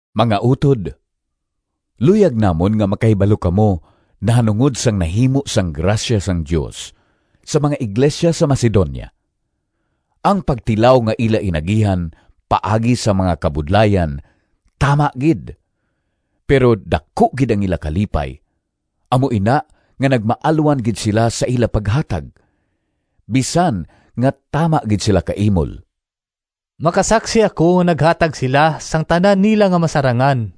Mga utod, luyag namon nga makahibalo kamo nahanungod sang nahimo sang grasya sang Dios sa mga iglesia sa Macedonia. Ang pagtilaw nga ila inagihan paagi sa mga kabudlayan tama gid, pero daku gid ang ila kalipay, amo ina nga nagmaalwan gid sila sa ila paghatag, bisan nga tama gid sila kaimol. Makasaksi ako nga naghatag sila sang tanan nila nga masarangan,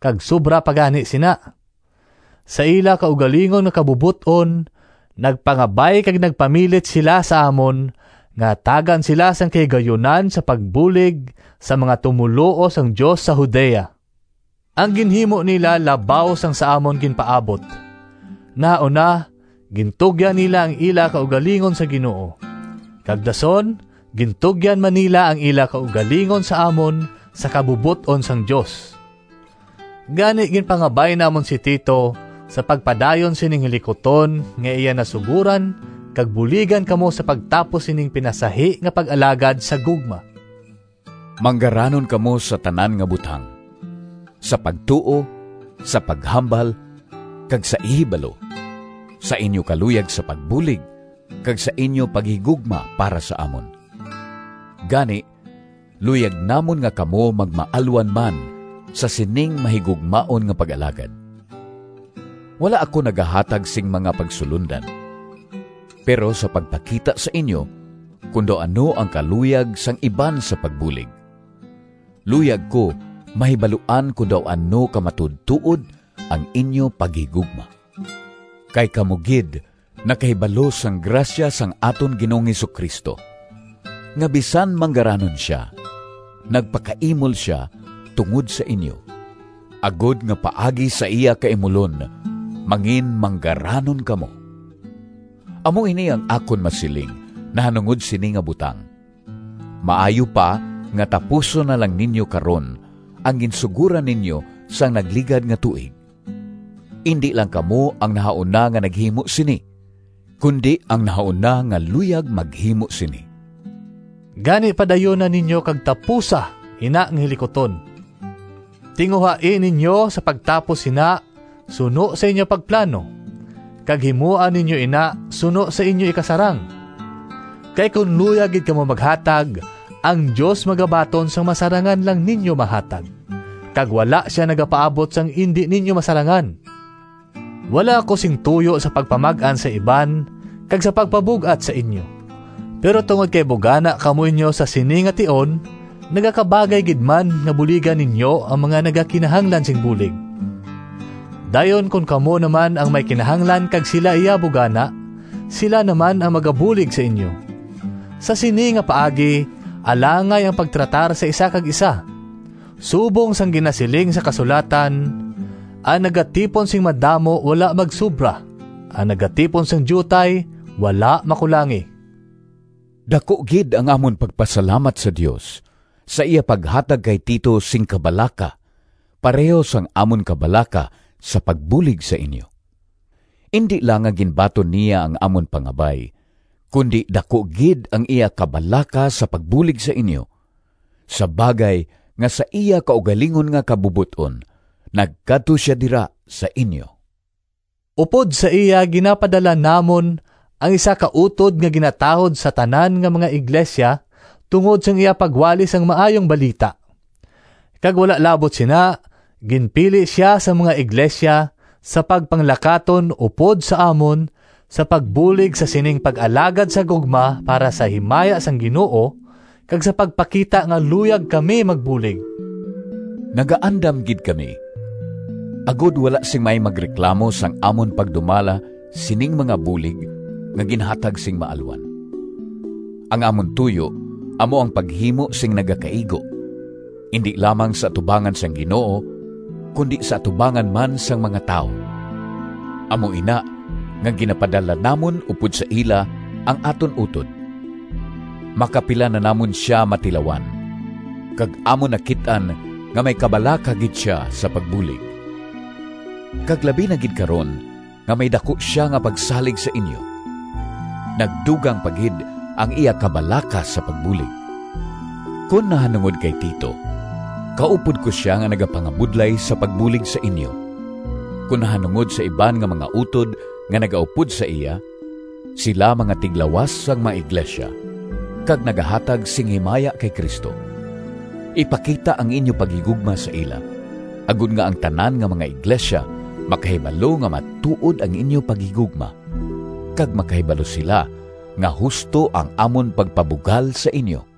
kag sobra pa gani sina. Sa ila kaugalingon nga kabubot-on nagpangabay kag nagpamilit sila sa amon nga hatagan sila sing kahigayunan sa pagbulig sa mga tumoluo sang Dios sa Judea. Ang ginhimo nila labaw sang sa amon ginpaabot! Nahauna, gintugyan nila ang ila kaugalingon sa Ginoo, kag dason gintugyan man nila ang ila kaugalingon sa amon sa kabubot-on sang Dios. Gani, ginpangabay namon si Tito sa pagpadayon sining hilikuton nga iya nasugoran kag buligan kamo sa pagtapos sining pinasahi nga pag-alagad sa gugma. Manggaranon kamo sa tanan nga butang: sa pagtuo, sa paghambal, kag sa ihibalo, sa inyo kaluyag sa pagbulig, kag sa inyo paghigugma para sa amon. Gani, luyag namon nga kamo magmaalwan man sa sining mahigugmaon nga pag-alagad. Wala ako nagahatag sing mga pagsulondan. Pero sa pagpakita sa inyo kon daw ano ang kaluyag sang iban sa pagbulig, luyag ko mahibaluan kon daw ano ka matuodtuod ang inyo paghigugma. Kay kamo gid nakahibalo sang grasya sang aton Ginoong Jesu-Cristo, nga bisan manggaranon sia, nagpakaimol sia tungod sa inyo, agod nga paagi sa iya kaimulon manginmanggaranon kamo. Amo ini ang akon masiling nahanungod sini nga butang: maayo pa nga tapuson na lang ninyo karon ang ginsugoran ninyo sang nagligad nga tuig. Indi lang kamo ang nahauna nga naghimo sini, kundi ang nahauna nga luyag maghimo sini. Gani, padayuna ninyo kag tapusa ina nga hilikuton! Tinguhai ninyo sa pagtapos sina suno sa inyo pagplano, kag himoa ninyo ina suno sa inyo ikasarang. Kay kon luyag gid kamo maghatag, ang Dios magabaton sang masarangan lang ninyo mahatag, kag wala sia nagapaabot sang indi ninyo masarangan. Wala ako sing tuyo sa pagpamag-an sa iban kag sa pagpabug-at sa inyo. Pero tungod kay bugana kamo inyo sa sini nga tion, nagakabagay gid man nga buligan ninyo ang mga nagakinahanglan sing bulig. Dayon kon kamo na man ang may kinahanglan kag sila iya bugana, sila na man ang magabulig sa inyo. Sa sini nga paagi alangay ang pagtratar sa isa kag isa. Subong sang ginasiling sang kasulatan: “Ang nagatipon sing madamo Wala magsobra, Ang nagatipon sing diutay Wala makulangi.” Daku gid ang amon pagpasalamat sa Dios sa iya paghatag kay Tito sing kabalaka pareho sang amon kabalaka sa pagbulig sa inyo! Indi lang nga ginbaton niya ang amon pangabay, kundi daku gid ang iya kabalaka sa pagbulig sa inyo, sa bagay nga sa iya kaugalingon nga kabubot-on nagkadto sia dira sa inyo. Upod sa iya ginapadala namon ang isa ka utod nga ginatahod sa tanan nga mga iglesia tungod sang iya pagwali sang Maayong Balita. Kag wala labot sina, ginpili sia sang mga iglesia sa pagpanglakaton upod sa amon sa pagbulig sa sining pag-alagad sa gugma para sa himaya sang Ginoo, kag sa pagpakita nga luyag kamo magbulig. Nagaandam gid kami agod wala sing may magreklamo sang amon pagdumala sining mga bulig nga ginhatag sing maalwan. Ang amon tuyo amo ang paghimo sing nagakaigo, indi lamang sa atubangan sang Ginoo, kundi sa atubangan man sang mga tawo. Amo ina nga ginapadala namon upod sa ila ang aton utod. Makapila na namon sia matilawan, kag amon nakit-an nga may kabalaka gid sia sa pagbulig. Kag labi na gid karon nga may daku sia nga pagsalig sa inyo, nagdugang pa gid ang iya kabalaka sa pagbulig. Kon nahanungod kay Tito, kaupod ko sia nga nagapangabudlay sa pagbulig sa inyo. Kon nahanungod sa iban nga mga utod nga nagaupod sa iya, sila mga tiglawas sang mga iglesia kag nagahatag sing himaya kay Cristo. Ipakita ang inyo paghigugma sa ila, agod nga ang tanan nga mga iglesia makahibalo nga matuod ang inyo paghigugma, kag makahibalo sila nga husto ang amon pagpabugal sa inyo.